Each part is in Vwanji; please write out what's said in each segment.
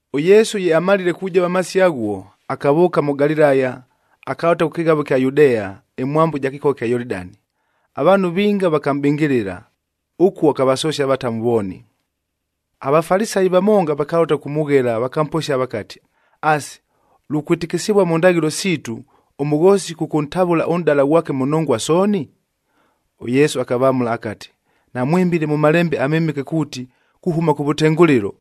ɄYesu ye amalile kujova amasio aghuo, akavʉʉka mʉ Galilaya, akalʉta kʉ kɨghavo ɨkya Yudea, ɨmwambo ɨja kɨkogha ɨkya Yolidani. Avaanhu vinga vakamʼbɨngɨlɨla, ʉkuo akavasosia avatamu vooni. AVafalisayi vamonga vakalʉta kʉkʉmʉghela, vakamposia vakati, “Asi, lukwɨtɨkɨsɨvua mʉ ndaghɨlo siitu, ʉmʉghoosi kʉkʉntavʉla ʉnʼdala ghwake mʉ nongwa sooni?” ɄYesu akavamʉla akati, “Namwɨmbile mʉ Malembe aMɨmɨke kuuti, kuhʉma kʉvʉtengʉlɨlo,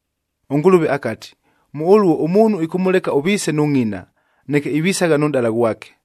ɄNgʉlʉve akati, ‘Mʉ ʉluo, ʉmuunhu ɨkʉmʉleka ʉviise nʉ ngʼina, neke ivisagha nʉ nʼdala ghwake,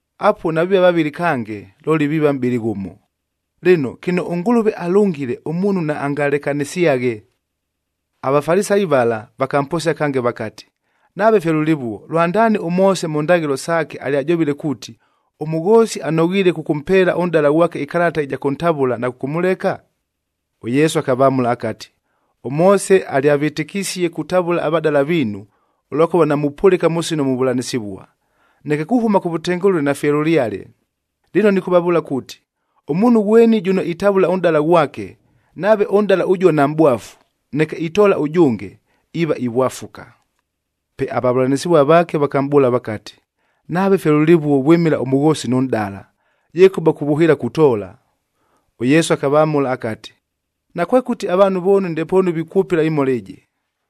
Apuo naviiva vavɨlɨ kange, looli viiva mʼbɨlɨ ghʉmo. Lɨno, kɨno ʉNgʉlʉve alʉngile, ʉmuunhu naangalekanɨsyaghe.” AVafalisayi vala vakamposia kange vakati, “Nave fye lʉlɨvuo, lwandaani ʉMoose mʉ ndaghɨlo saake alyajovile kuuti, ʉmʉghoosi anoghiile kʉkʉmpeela ʉnʼdala ghwake ɨkalata ɨja kʉntavʉla na kʉkʉmʉleka?” ɄYesu akavamʉla akati, “ɄMoose alyavɨtɨkisie kutavʉla avadala viinu, ʉlwakʉva namupʉlɨka mʉ sino muvʉlanɨsɨvua. Neke kuhʉma kʉvʉtengʉlɨlo nafye lʉlyale. Lɨno nɨkʉvavʉʉla kuuti, ʉmuunhu ghweni jʉno itavʉla ʉnʼdala ghwake, nave ʉnʼdala ʉjuo namʼbwafu, neke itoola ʉjʉnge, iiva ivwafuka.” Pe avavʉlanɨsɨvua vaake vakamʼbʉʉla vakati, “Nave fye lʉlɨvuo vwɨmɨla ʉmʉghoosi nʉ nʼdala, yekʉba kuvʉhɨɨla kutoola!” ɄYesu akavamʉla akati, “Nakwekʉti avaanhu vooni ndepoonu vikwʉpɨla ɨmhola ɨjɨ,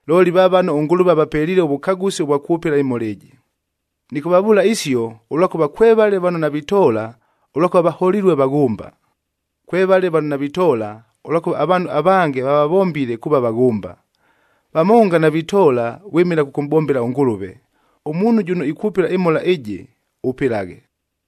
looli va vano ʉNgʉlʉve avapeliile ʉvʉkagʉsi ʉvwa kwʉpɨla ɨmhola ɨjɨ. Nɨkʉvavʉʉla isio, ʉlwakʉva kwevale vano navitoola ʉlwakʉva vaholilue vaghʉmba. Kwevale vano navitoola ʉlwakʉva avaanhu avange vavavombile kuuva vaghʉmba. Vamonga navitoola vwɨmɨla kʉkʉmʼbombela ʉNgʉlʉve. Ʉmuunhu jʉno ikwʉpɨla ɨmhola ɨjɨ, ʉpɨlaghe.”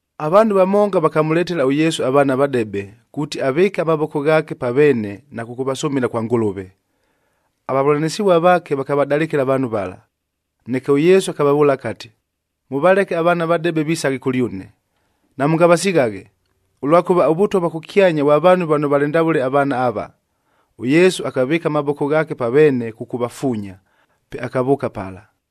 Avaanhu vamonga vakamʉletela ʉYesu avaana avadebe, kuuti avɨɨke amavoko ghaake pa veene na kʉkʉvasʉmɨla kwa Ngʉlʉve. Avavʉlanɨsɨvua vaake vakavadalɨkɨla avaanhu vala. Neke ʉYesu akavavʉʉla akati, “Mʉvaleke avaana avadebe visaghe kʉlyʉne, namʉngavasighaghe, ʉlwakʉva ʉVʉtwa vwa kʉkyanya vwa vaanhu vano valɨ ndavʉle avaana ava.” ɄYesu akavɨɨka amavoko ghaake pa veene kʉkʉvafuunya, pe akavʉʉka pala.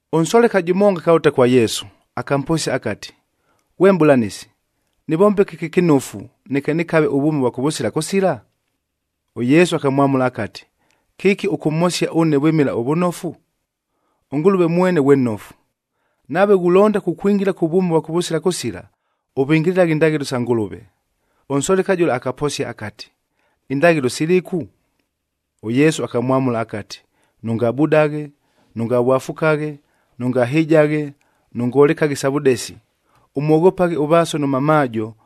Ʉnsoleka jʉmonga akalʉta kwa Yesu, akamposia akati, “Ghwe Mʼbʉlanɨsi, nɨvombe kɨki ɨkɨnofu, neke nɨkave ʉvwʉmi ʉvwa kʉvʉsila kʉsila?” ɄYesu akamwamʉla akati, “Kɨki ʉkʉmhosia ʉne vwɨmɨla ʉvʉnofu? ɄNgʉlʉve mwene ghwe nnofu! Nave ghulonda kukwingila kʉ vwʉmi ʉvwa kʉvʉsila kʉsila, ʉvɨngɨlɨlaghe indaghɨlo sa Ngʉlʉve.” Ʉnsoleka jʉla akaposia akati, “Indaghɨlo silɨku?” ɄYesu akamwamʉla akati, “Nʉngabudaghe, nʉngavwafukaghe, nʉngahɨjaghe, nʉngolekaghe isa vʉdesi, ʉmwoghopaghe ʉvaaso nʉ mamaajo,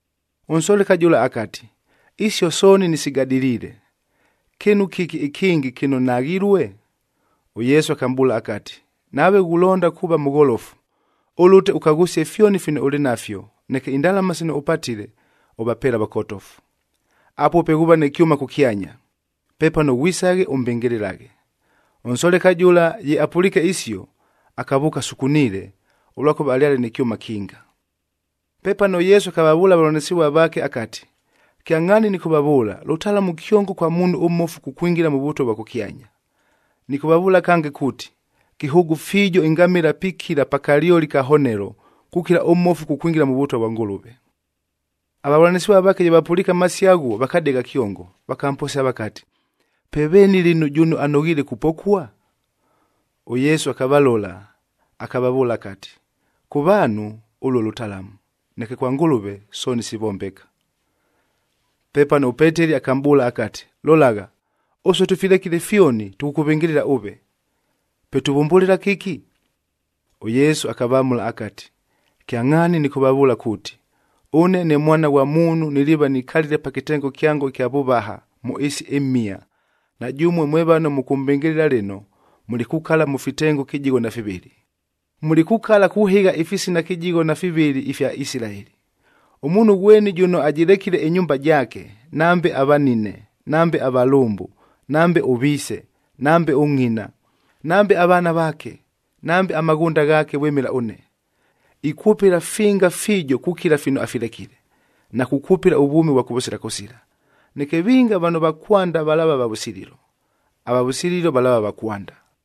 Ʉnsoleka jʉla akati, “Isio sooni nɨsigadɨliile! Kɨɨnu kɨki ɨkɨngɨ kɨno naghilue?” ɄYesu akamʼbʉʉla akati, “Nave ghulonda kuuva mʉgholofu,d ʉlʉte ʉkaghʉsie fyoni fino ʉlɨ nafyo, neke indalama sino ʉpatile, ʉvapeele avakotofu. Apuo pe ghuuva nɨ kyʉma kʉkyanya. Pepano ghwisaghe, ʉmbɨngɨlɨlaghe.” Ʉnsoleka jʉla ye apʉliike isio, akavʉʉka asukuniile, ʉlwakʉva alyale nɨ kyʉma kinga. Pepano ʉYesu akavavʉʉla avavʉlanɨsɨvua vaake akati, “Kyangʼhaani nɨkʉvavʉʉla, lʉtalamu kyongo kwa muunhu ʉmmofu kukwingila mʉ Vʉtwa vwa kʉkyanya. Nɨkʉvavʉʉla kange kuuti, kɨhʉʉgʉ fiijo ɨngamɨla pikila pa kalyoli ka honelo, kukila ʉmmofu kukwingila mʉ Vʉtwa vwa Ngʉlʉve.” Avavʉlanɨsɨvua vaake ye vapʉliike amasio aghuo, vakadegha kyongo, vakamposia vakati, “Pe veeni lɨno jʉno anoghiile kupokua?” ɄYesu akavalola, akavavʉʉla akati, “Kʉ vaanhu, ʉluo lʉtalamu, neke kwa Ngʉlʉve sooni sivombeka.” Pepano ʉPeteli akamʼbʉʉla akati, “Lolagha, ʉsue tʉfilekile fyoni, tʉkʉkʉvɨngɨlɨla ʉve! Pe tuvʉmbʉlɨla kɨki?” ɄYesu akavamʉla akati, “Kyangʼhaani nɨkʉvavʉʉla kuuti, ʉne ne Mwana ghwa Muunhu niliiva nikalile pa kɨtengo kyango ɨkya vʉvaha mʉ ɨɨsi ɨmhia, na jʉmue mwe vano mʉkʉmbɨngɨlɨla lɨno, mulikukala mʉ fitengo kɨjigho na fivɨlɨ. Mulikukala kuhɨgha ifisina kɨjigho na fivɨlɨ ifya Isilaeli. Ʉmuunhu ghweni jʉno ajɨlekile ɨnyumba jaake, nambe avanine, nambe avalʉmbʉ, nambe ʉviise, nambe ʉngʼina, nambe avaana vaake, nambe amaghʉnda ghaake vwɨmɨla ʉne, ikwʉpɨla finga fiijo kukila fino afilekile,e na kukwʉpɨla ʉvwʉmi ʉvwa kʉvʉsila kʉsila. Neke vinga vano va kwanda valaava va vʉsililo, ava vʉsililo valaava va kwanda.